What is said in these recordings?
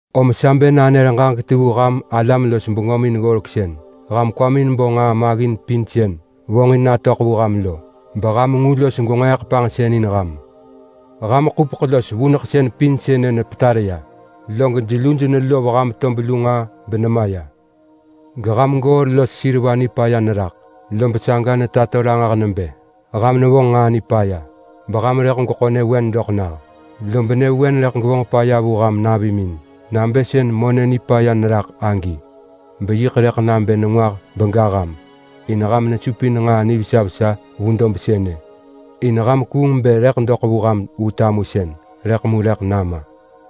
Om sa bë nanër ġaġek ti vu ham alam los bengömin ggoreksën! Ham kwamin bo nġaa maggin pin sën vonġin natöḳ vu ham lo, beham ngu los gwenġeeḳ panġsën in ham. Ham ḳupeḳ los vuneḳsën pin sënë nepetar ya, log jeluj nelov ham tob lu nġaa benemaya. Geham goor los seriva nipaya neraḳ, lob saga netato ranġah nebë ham nevonġ nġaa nipaya beham rëḳ gweḳo nyëvewen doḳ nah. Lob nyëvewen rëḳ gevonġ paya vu ham navimin nabë sën monë nipaya neraḳ agi. Beyiḳ rëḳ nabë nengwah bega ham in ham nesupin nġaa nivesa vesa vu dob sënë in ham kuung bë rëḳ doḳ vu ham vu tamusën, rëḳ mu rëḳ nama.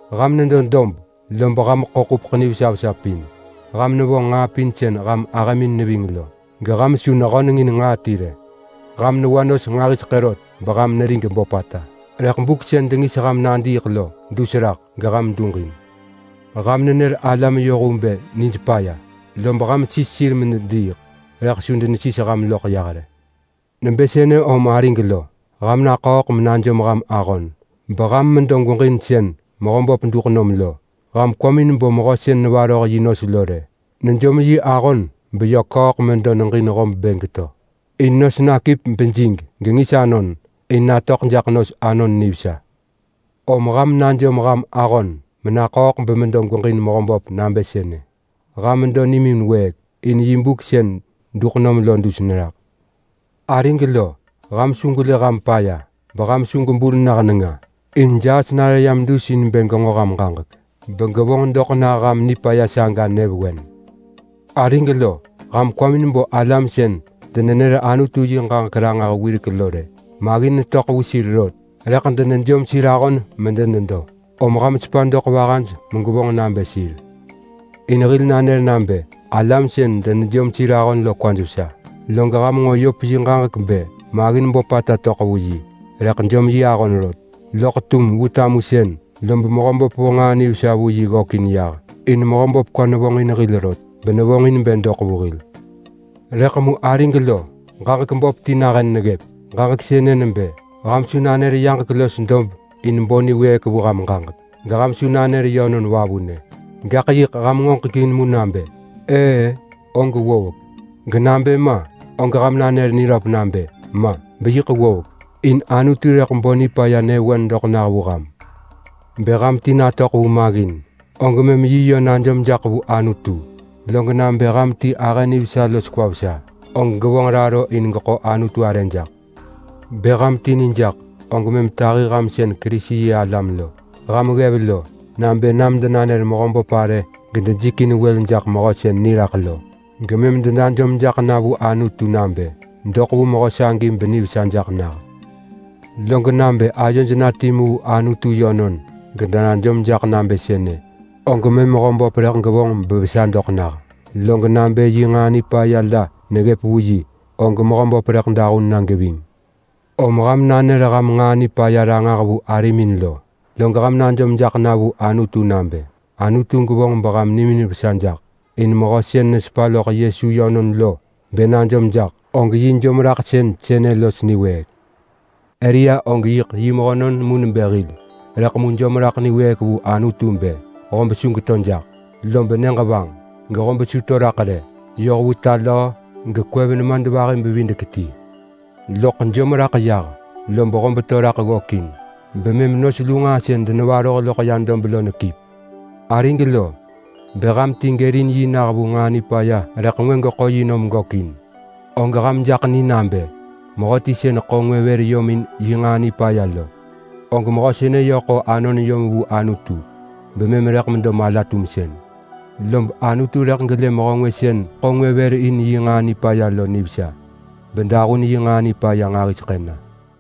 Ham nedo dob, lob ham ḳo ḳupeḳ nivesa vesa pin. Ham nevonġ nġaa pin sën ham ahëmin neving lo, geham su nehönengin nġaa ti rë. Ham newa nos nġahiseḳë rot beham nerig böpata, rëḳ buk sën dengis ham nadiiḳ lo dus raḳ geham duġin. Ham nër alam yohvu bë nij paya, lob ham sis sir medediiḳ rëḳ su denesis ham loḳ yah rë. Nebë sënë om arig lo! Ham naḳööḳ menajom ham ahon beham medo gweġin sën Mehöböp duḳ nom lo. Ham kwamin bo mehö sën nevaroh yi nos lo rë! Nejom yi ahon beyö ḳööḳ medo neġin hob bë geto in nos nakip bejig gengis anon in natöḳ jaḳ nos anon nivesa. Om ham najom ham ahon menaḳööḳ bemedo gweġin Mehöböp nabë sënë! Ham medo nimin wëëk, in yi buk sën duḳ nom lo dus neraḳ. Arig lo, ham su gwelë ham paya, beham su gwebul nah nenga, in jaas nare yam dus in bë genġo ham ġaġek begevonġ doḳ nah ham nipaya saga nyëvewen. Arig lo, ham kwamin bo alam sën denenër Anutu yi ġaġek ranġah wirek lo rë! Maggin töḳ vu sir rot, rëḳ denejom sir ahon medenedo, om ham sepa doḳ vahaj megwevonġ nabë sir. In hil nanër nabë alam sën denejom sir ahon lo kwaj vesa. Log ham nġo Yop yi ġaġek bë maggin böpata töḳ vu yi rëḳ jom yi ahon rot. Loḳ tum vu tamusën lob Mehöböp vo nġaa nivesa vu yi ggökin yah. In Mehöböp kwa nevonġin hil rot benevonġin bë doḳ vu hil. Rëḳ mu arig lo, ġaġek böp ti nahën neggëp! Ġaġek sënë nebë: Ham su nanër yaġek los dob in bo niwëëk vu ham ġaġek, geham su nanër yönon vavunë! Gaḳ yiḳ ham ngoġek in mu nabë, “Ëë-ë!” og ggovek. Genabë ma, og ham nanër niröp nabë, “Ma!” beyiḳ ggovek. In Anutu rëḳ bo nipaya nyëvewen doḳ nah vu ham. Bë ham ti natöḳ vu maggin, og mëm yi yö najom jaḳ vu Anutu. Log nabë ham ti ahë nivesa los kwa vesa, og gevonġ raro in geḳo Anutu arë jaḳ. Bë ham ti nijaḳ, og mëm tahi ham sën Kerisi-yi-alam lo ham ggev lo nabë nam denanër Mehöböp arë gedejikin wël jaḳ mehö sën niraḳ lo. Gemëm denajom jaḳ na vu Anutu nabë doḳ vu mehö sagi benivesa jaḳ nah. Log nabë ayoj na timu vu Anutu yönon gedenajom jaḳ nabë sënë, og mëm Mehöböp rëḳ gevonġ bevesa doḳ nah. Log nabë yi nġaa nipaya la neggëp vu yi, og Mehöböp rëḳ dahun na geving. Om ham nanër ham nġaa nipaya ranġah vu arimin lo, log ham najom jaḳ na vu Anutu nabë Anutu gevonġ beham nimin vesa jaḳ. In mehö sën nesepa loḳ Yesu yönon lo bë najom jaḳ, og yi jomraḳsën sënë los niwëëk. Elia og yiḳ yi mehönon mu nebë hil, rëḳ mu jom raḳ niwëëk vu Anutu bë hob su geto jaḳ, lob nyëġ vanġ gehob su to raḳ rë yoh vu ta löö gekwev nemadvahi-bevidek-ti. Loḳ jom raḳ yah, lob hob to raḳ ggökin, bemëm nos lu nġaa sën denevaroh loḳ ya dob lo nekip. Arig lo, bë ham ti gërin yi nah vu nġaa nipaya rëḳ ngwë geḳo yi nom gökin, og ham jaḳ ni nabë mehöti sën ḳo ngwë yom in yi nġaa nipaya lo, og mehö sënë yö ḳo anon yom vu Anutu bemëm rëḳ medo mala-tumsën. Lob Anutu rëḳ gelë mehö ngwë sën ḳo ngwë vër in nġaa nipaya lo nivesa bedahun yi nġaa nipaya pin na.